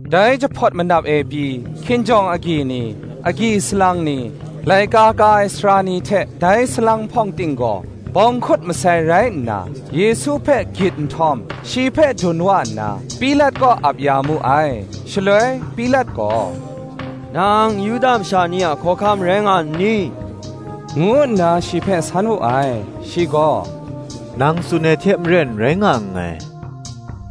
Dai jahpawt manap e pyi, hkinjawng agyi ni, agyi salang ni, laika ka ai sara ni hte dai salang hpawng ting gaw bawng hkut masai rai nna, Yesu hpe gyit nhtawm, shi hpe dun wa nna, Pilat kaw ap ya mu ai. Shaloi, Pilat gaw, “Nang Yuda masha ni a hkawhkam rai nga nni?” ngu nna shi hpe san wu ai. Shi gaw, “Nang tsun ai hte maren rai nga nngai,”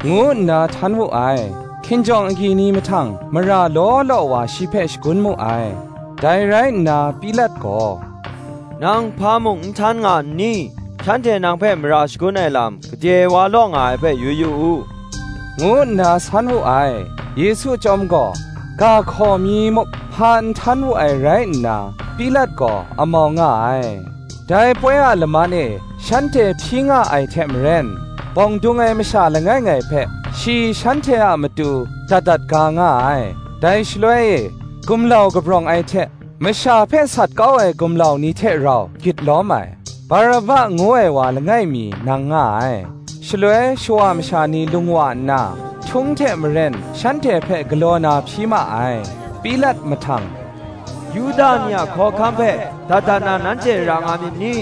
ngu nna htan wu ai. Hkinjawng agyi ni mahtang, mara law law wa shi hpe shagun mu ai. Dai rai nna Pilat gaw, “Nang hpa muk n htan nga nni? shanhte nang hpe mara shagun ai lam, gade wa law nga ai hpe yu yu u,” ngu nna san wu ai. Yesu chyawm gaw, ga hkaw mi muk, hpa n htan wu ai rai nna, Pilat gaw amau nga ai. Dai poi a laman e, shanhte hpyi nga ai hte maren, bawng dung ai masha langai ngai hpe shi shanhte a matu dat dat ga nga ai. Dai shaloi e, gumlau kabrawng ai hte masha hpe sat kau ai gumlau ni hte rau gyit lawm ai, Baraba ngu ai wa langai mi, nang nga ai. Shaloi shawa masha ni lung wa nna, htung hte maren shanhte hpe galaw na hpyi ma ai. Pilat mahtang, “Yuda ni a hkawhkam hpe dat dat na nanhte ra nga myit ni?”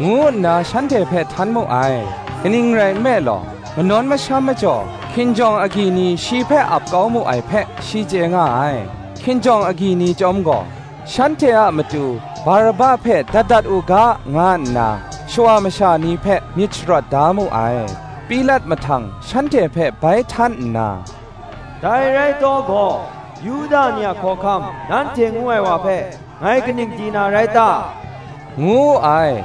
ngu nna shanhte hpe htan mu ai. kaning rai nme law, manawn masham majaw, hkinjawng agyi ni shi hpe ap kau mu ai hpe, shi chye nga ai. Hkinjawng agyi ni chyawm gaw, shanhte a matu Baraba hpe dat dat u ga, nga nna shawa masha ni hpe myit sharawt da mu ai. Pilat mahtang shanhte hpe bai htan nna, “Dai rai taw gaw, Yuda ni a hkawhkam, nanhte ngu ai wa hpe ngai kaning di na rai ta?” ngu wu ai.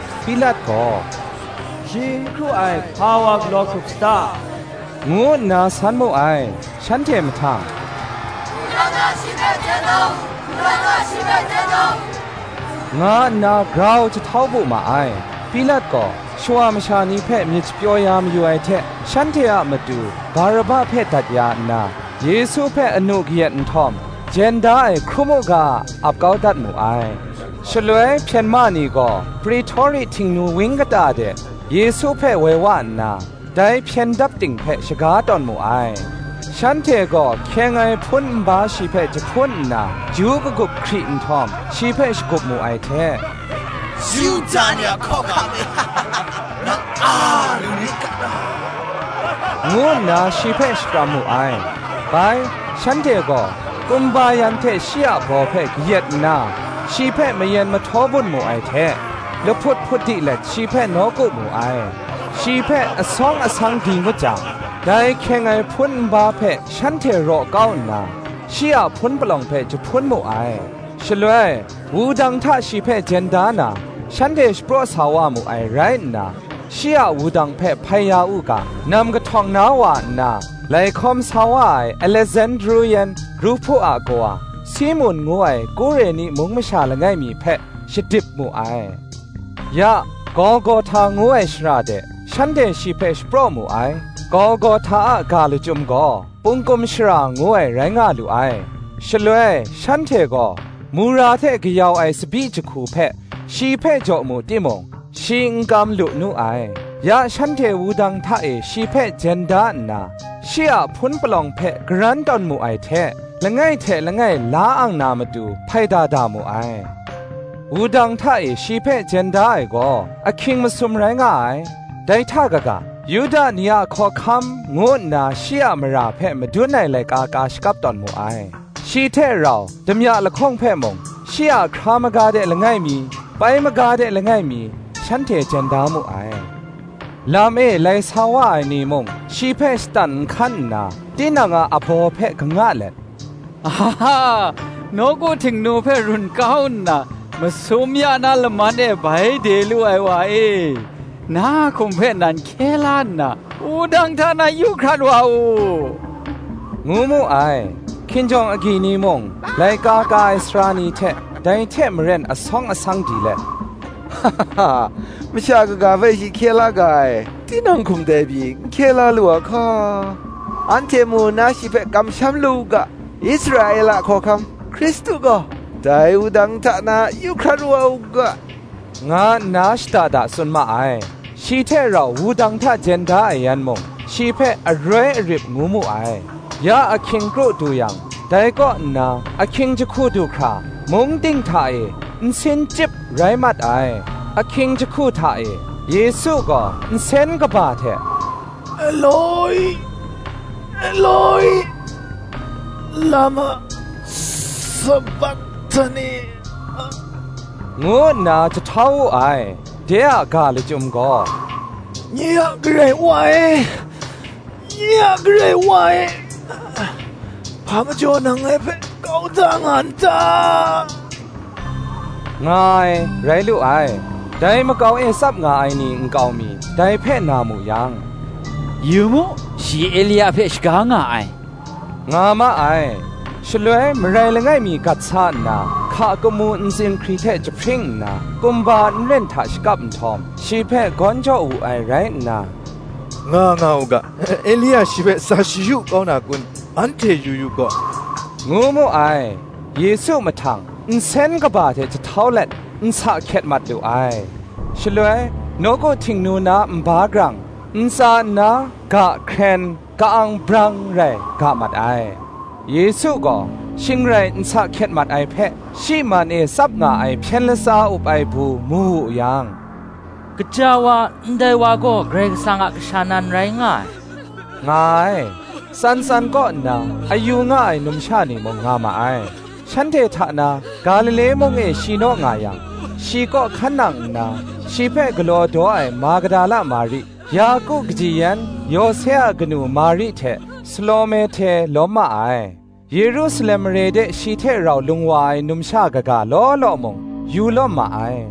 Pilat gaw, “Shi n hkru ai hpa wa galaw hkrup sata?” ngu nna san mu ai. Shanhte mahtang, “Wudang hta shi hpe jen da u,” nga nna grau jahtau bu ma ai. Pilat gaw shawa masha ni hpe myit shapyaw ya mayu ai hte, shanhte a matu Baraba hpe dat ya nna, Yesu hpe anu kayat nhtawm, jen da ai hkrum u ga, ap kau dat mu ai. Shaloi hpyen ma ni gaw Pretori Htingnu wang kata de, Yesu hpe woi wa nna, dai hpyen dap ting hpe shaga tawn mu ai. Shanhte gaw hkyeng ai hpun nba shi hpe jahpun nna, ju lagup hkri nhtawm, shi hpe shagup mu ai hte, “Yuda ni a hkawhkam e, nang a lu nit ga law!” ngu nna shi hpe shakram mu ai. Bai, shanhte gaw kumba yan hte shi a baw hpe kayat nna, shi hpe mayen mahtaw bun mu ai hte, lahput hput di let shi hpe nawku mu ai. Shi hpe asawng asang di ngut jang, dai hkyeng ai hpun nba hpe shanhte raw kau nna, shi a hpun palawng hpe jahpun mu ai. Shaloi, wudang hta shi hpe jen da na, shanhte shapraw sa wa mu ai rai nna, shi a wudang hpe hpai ya u ga, nam kahtawng na wa nna, lai hkawm sa wa ai Alesandru yan Ruhpu a kawa, Simun ngu ai Kureni mung masha langai mi hpe, shadip mu ai. Ya, Golgohta ngu ai shara de shanhte shi hpe shapraw mu ai; Golgohta a ga lachyum gaw, Pungkum shara ngu ai rai nga lu ai. Shaloi shanhte gaw mura hte kayau ai tsabyi jahku hpe shi hpe jaw mu timung, shi n kam lu nu ai. Ya shanhte wudang hta e shi hpe jen da nna, shi a hpun palawng hpe karan tawn mu ai hte, langai hte langai la ang na matu hpaida da mu ai. Wudang hta e shi hpe jen da ai gaw, ahkying masum rai nga ai. Dai hta kaga, “Yuda ni a Hkawhkam,” ngu nna shi a mara hpe madun ai laika ka shakap tawn mu ai. Shi hte rau damya lahkawng hpe mung, shi a hkra maga de langai mi, pai maga de langai mi, shanhte jen da mu ai. Lam e lai sa wa ai ni mung shi hpe shatan nhkan nna, tinang abaw hpe kanga let, “Aha! nawku Htingnu hpe run kau nna, masum ya na laman e bai de lu ai wa e, na a hkum hpe nan hkye la nna, wudang hta na yu hkrat wa u,” ngu mu ai. Hkinjawng agyi ni mung, laika ka ai sara ni hte, dai hte maren asawng asang di let, “Masha kaga hpe shi hkye la ga ai; tinang hkum dai pyi n hkye la lu a hka! anhte mu nna shi hpe kamsham lu u ga, Israela Hkawhkam, Hkristu gaw, dai wudang hta na ya yu hkrat wa u ga,” nga nna shada da tsun ma ai. Shi hte rau wudang hta jen da ai yan mung, shi hpe aroi arip ngu mu ai. Ya ahkying kru du yang, dai kaw nna ahkying jahku du hkra, mung ting hta e nsin chyip rai mat ai. Ahkying jahku hta e, Yesu gaw nsen kaba hte, “Elo-i, Elo-i, lama sabakhtani?” ngu nna jahtau wu ai; de a ga lachyum gaw, “Nye a Karai Wa e, Nye a Karai Wa e, hpa majaw nang ngai hpe kau da nga n ta?” nga ai, rai lu ai. Dai makau e tsap nga ai ni nkau mi, dai hpe na mu yang, “Yu mu, shi Elia hpe shaga nga ai,” nga ma ai. Shaloi marai langai mi gat sa nna, hka kamu ntsin hkri hte jahpring nna, kumba nren hta shakap nhtawm, shi hpe gawn jaw wu ai rai nna, “Nga nga u ga, Elia shi hpe sa shayu kau na kun, anhte yu yu gaw,” ngu mu ai. Yesu mahtang nsen kaba hte jahtau let, nsa hkyet mat lu ai. Shaloi nawku Htingnu na nba grang, ntsa nna ga hkren, ka-ang brang rai ga mat ai. Yesu gaw shing rai nsa hkyet mat ai hpe, shi man e tsap nga ai hpyen latsa up ai du mu wu yang, “Gaja wa, ndai wa gaw Karai Kasang a Kasha nan rai nga ai,” nga ai. Tsan tsan kaw nna, a yu nga ai numsha ni mung, nga ma ai: shanhte hta na, Galile mung e shi naw nga yang, shi kaw hkan nang nna, shi hpe galaw daw ai Magadala Mari, Yaku kaji yan Yose a kanu Mari hte, Salome hte lawm ma ai: Yerusalem mare de shi hte rau lung wa ai numsha kaga law law mung, yu lawm ma ai.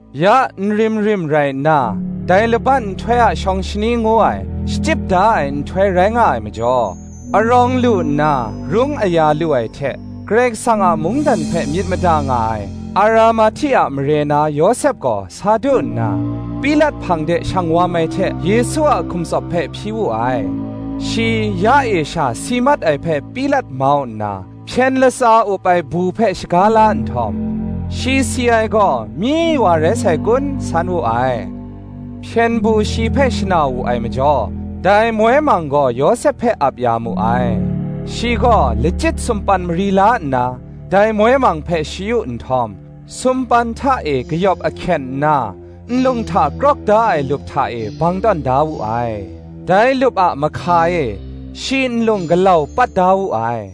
Ya nrim rim rai nna dai laban nhtoi a shawng shani ngu ai, shachyip da ai nhtoi rai nga ai majaw, arawng lu nna rung aya lu ai hte, Karai Kasang a mungdan hpe myit mada nga ai, Aramahti a mare na Yawsep gaw sa du nna, Pilat hpang de shang wam ai hte Yesu a hkum tsawp hpe hpyi wu ai. Shi ya e sha si mat ai hpe Pilat mau nna, hpyen latsa up ai du hpe shaga la nhtawm, “shi si ai gaw myi wa rai sai kun,” san wu ai. Hpyen du shi hpe shana wu ai majaw, dai moi mang gaw, Yawsep hpe ap ya mu ai. Shi gaw lachyit sumpan mari la nna dai moi mang hpe shayu nhtawm, sumpan hta e kayawp ahkyen nna, nlung hta krawk da ai lup hta e bang tawn da wu ai: dai lup a mahka e, shi nlung galau pat da wu ai.